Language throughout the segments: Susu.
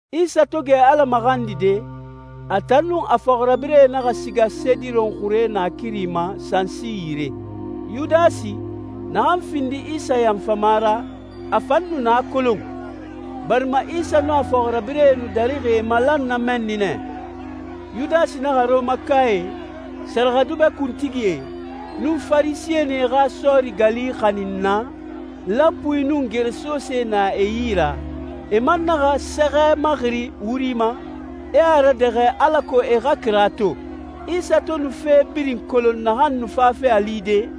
Isa to gɛ Ala maxandide, a tan nun a fɔxirabirɛe naxa siga Sediron xure naakiri ma sansi yire. Yudasi, naxan findi Isa yanfama ra, a fan nu na kolon, barima Isa nun a fɔxirabirɛe nu darixi e malan na mɛnni nɛ. Yudasi naxa Rɔmakae, sɛrɛxɛdubɛ kuntigie, nun Farisɛnie xa sɔɔri gali xanin naa, lanpuie nun geresosee na e yi ra. E man naxa sɛxɛ maxiri wuri ma, e a radɛxɛ alako e xa kira to. Isa to nu fe birin kolon naxan nu fafe a lide,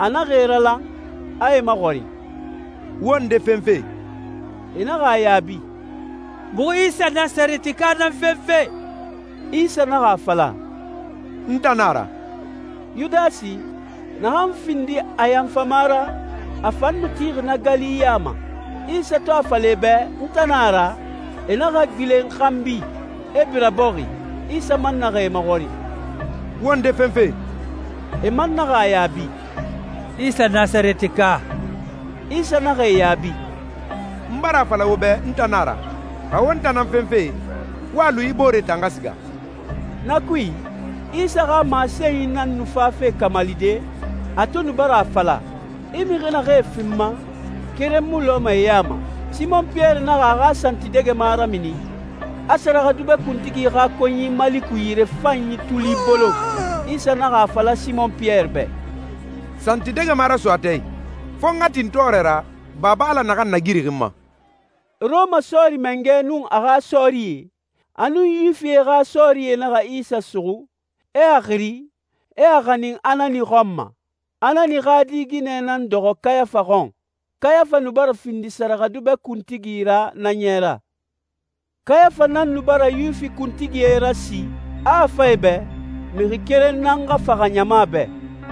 a naxa e ralan, a e maxɔrin, «Wo nde fenfe?» E naxa a yaabi, «Muxu Isa Nasarɛtika nan fenfe.» Isa naxa a fala, «N tan nan na a ra.» Yudasi, naxan findi a yanfama ra, a fan nu tixi na gali ya ma. Isa to a fala e bɛ, «N tan nan na a ra», e naxa gbilen xanbi, e bira bɔxi. Isa man naxa e maxɔrin, «Wo nde fenfe?» E man naxa a yaabi, «Isa Nasarɛtika.» Isa naxa e yaabi, «N bara a fala wo bɛ, n tan nan a ra. Xa wo n tan nan fenfe, wo a lu yi booree tan xa siga.» Na kui, Isa xa masenyi nan nu fafe kamalide, a to nu bara a fala, «I mixi naxee fi n ma, keren mu lɔɛ e ya ma.» Simɔn Piyɛri naxa a xa santidɛgɛma ramini, a sɛrɛxɛdubɛ kuntigi xa konyi Maliku yirefanyi tuli bolon. Isa naxa a fala Simɔn Piyɛri bɛ, «Santidɛgɛma raso a tɛɛ i. Fo n xa tin tɔɔrɛ ra Baba Ala naxan nagiri n ma.» Rɔma sɔɔri mangɛ nun a xa sɔɔrie, a nun Yuwifie xa sɔɔrie naxa Isa suxu, e a xiri, e a xanin Anani xɔn ma. Anani xa di ginɛ nan dɔxɔ Kayafa xɔn. Kayafa nu bara findi sɛrɛxɛdubɛ kuntigi ra na ɲɛ ra. Kayafa nan nu bara Yuwifi kuntigie rasi, a a fan e bɛ, mixi keren nan xa faxa ɲama bɛ.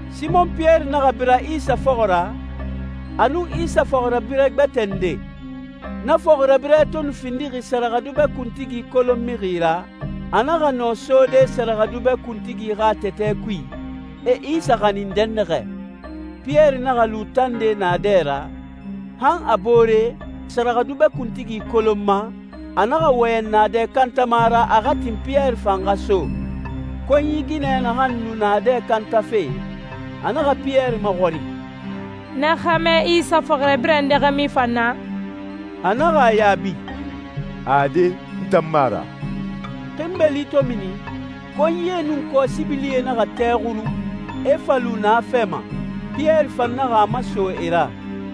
Simɔn Piyɛri naxa bira Isa fɔxɔ ra, a nun Isa fɔxirabirɛ gbɛtɛ nde. Na fɔxirabirɛ to nu findixi sɛrɛxɛdubɛ kuntigi kolon mixi ra, a naxa nɔ sode sɛrɛxɛdubɛ kuntigi xa tɛtɛ kui, e Isa xanin dɛnnaxɛ. Piyɛri naxa lu tande naadɛ dɛ ra, han a boore, sɛrɛxɛdubɛ kuntigi kolonma, a naxa wɔyɛn naadɛ kantama ra a xa tin Piyɛri fan xa so. Konyi ginɛ naxan nu naadɛ kantafe, a naxa Piyɛri maxɔrin, «Na xɛmɛ Isa fɔxirabirɛ nde xa mu i fan na?» A naxa a yaabi, «Ade, n tan mu a ra!» Xinbeli to mini, konyie nun kɔsibilie naxa tɛ xuru, e fa lu na fɛ ma. Piyɛri fan naxa a maso e ra.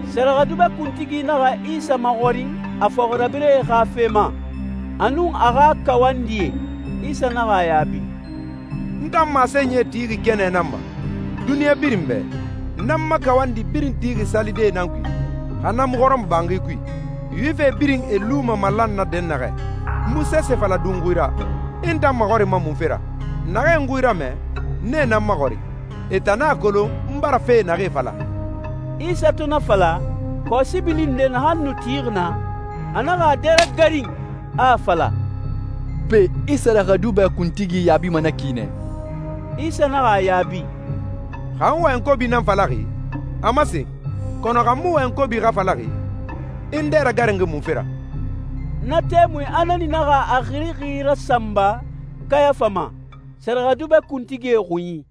Sɛrɛxɛdubɛ kuntigi naxa Isa maxɔrin a fɔxirabirɛe xa fe ma, a nun a xa kawandie. Isa naxa a yaabi, «N tan masenyie tixi kɛnɛ nan ma, duniɲa birin bɛ. N nan n ma kawandi birin tixi salidee nan kui, xa na mu hɔrɔmɔbanxi kui, Yuwifie birin e luma malan na dɛnnaxɛ. N mu sese fala dunxui ra. I n tan maxɔrinma munfe ra? Naxee n xui ramɛ, nee nan maxɔrin. E tan nan a kolon n bara fee naxee fala.» Isa to na fala, kɔsibili nde naxan nu tixi naa, a naxa a dɛ ragarin, a a fala, «Pe, I sɛrɛxɛdubɛ kuntigi yaabima na ki nɛ?» Isa naxa a yaabi, «Xa n wɔyɛn kobi nan falaxi, a masen. Kɔnɔ xa n mu wɔyɛn kobi xa falaxi, i n dɛ ragarinxi munfe ra?» Na tɛmui, Anani naxa a xirixi rasanba Kayafa ma, sɛrɛxɛdubɛ kuntigie xunyi.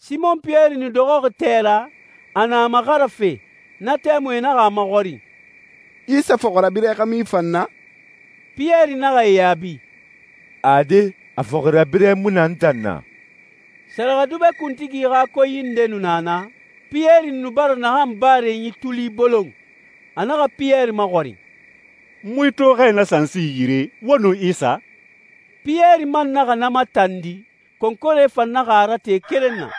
Simɔn Piyɛri nu dɔxɔxi tɛ ra, a na a maxarafe. Na tɛmui e naxa a maxɔrin, «Isa fɔxirabirɛ xa mu i fan na?» Piyɛri naxa e yaabi, «Ade, a fɔxirabirɛ mu na n tan na.» Sɛrɛxɛdubɛ kuntigi xa konyi nde nu na naa, Piyɛri nu bara naxan barenyi tuli bolon. A naxa Piyɛri maxɔrin, «N mu i to xɛ na sansi yire, wo nun Isa?» Piyɛri man naxa na matandi, konkore fan naxa a rate keren na.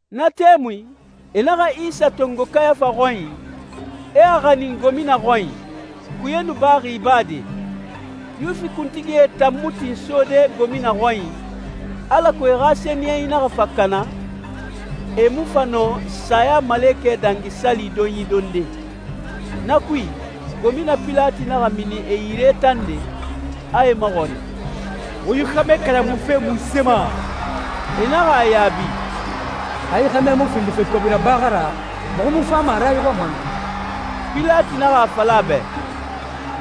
Na tɛmui, e naxa Isa tongo Kayafa xɔnyi, e a xanin gomina xɔnyi. Kuye nu baxi ibade. Yuwifi kuntigie tan mu tin sode gomina xɔnyi, alako e xa sɛniyɛnyi naxa fa kana, e mu fa nɔ Sayamalekɛ Dangi Sali donyi donde. Na kui, gomina Pilati naxa mini e yire tande, a e maxɔrin, «Wo yi xɛmɛ kalamufe munse ma?» E naxa a yaabi, «Xa yi xɛmɛ mu findi fe kobi raba xa ra, muxu mu fama a ra i xɔn ma nu.» Pilati naxa a fala e bɛ,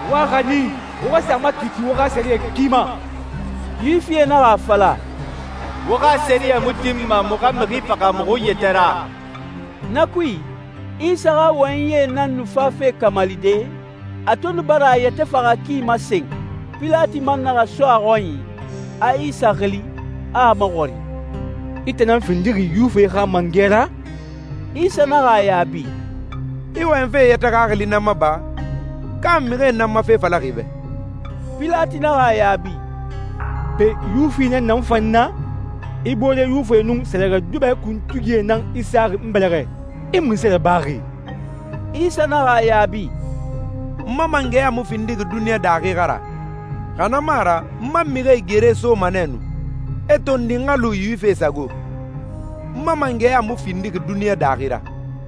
«Wo a xanin, wo xa sa a makiiti wo xa sɛriyɛ ki ma.» Yuwifie naxa a fala, «Wo xa sɛriyɛ mu tinma muxu xa mixi faxa muxu yɛtɛ ra.» Na kui, Isa xa wɔyɛnyi nan nu fafe kamalide, a to nu bara a yɛtɛ faxa ki masen. Pilati man naxa so a xɔnyi, a Isa xili, a a maxɔrin, «I tan nan findixi Yuwifie xa mangɛ ra?» Isa naxa a yaabi, «I wɔyɛnfe i yɛtɛ xaxili nan ma ba, ka mixie nan n ma fe fala i bɛ?» Pilati naxa a yaabi, «Pe, Yuwifi nan na n fan na? I boore Yuwifie nun sɛrɛxɛdubɛ kuntigie nan i saxi n bɛlɛxɛ. I munse rabaxi?» Isa naxa a yaabi, «N ma mangɛya mu findixi duniɲa daaxi xa ra, xa na mu a ra n ma mixie gere soma nɛ nu, e tondi n xa lu Yuwifie sago. N ma mangɛya mu findixi duniɲa daaxi ra.»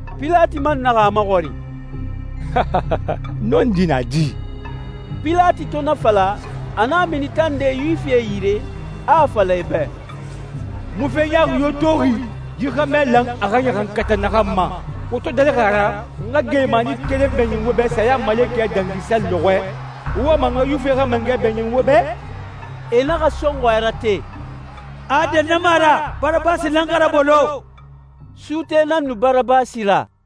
Pilati man naxa a maxɔrin, «Nɔndi na di?» Pilati to na fala, a naxa mini tande Yuwifie yire, a a fala e bɛ, «N mu fe ɲaaxi yo toxi yi xɛmɛ lan a xa ɲaxankata naxan ma. Wo to darixi a ra n xa geelimani keren bɛɲin wo bɛ Sayamalekɛ Dangi Sali lɔxɔɛ, wo wama n xa Yuwifie xa mangɛ bɛɲin wo bɛ?» E naxa sɔnxɔɛ rate, «Ade, na mu a ra! Barabasi nan xa rabolo.» Suute nan nu Barabasi ra.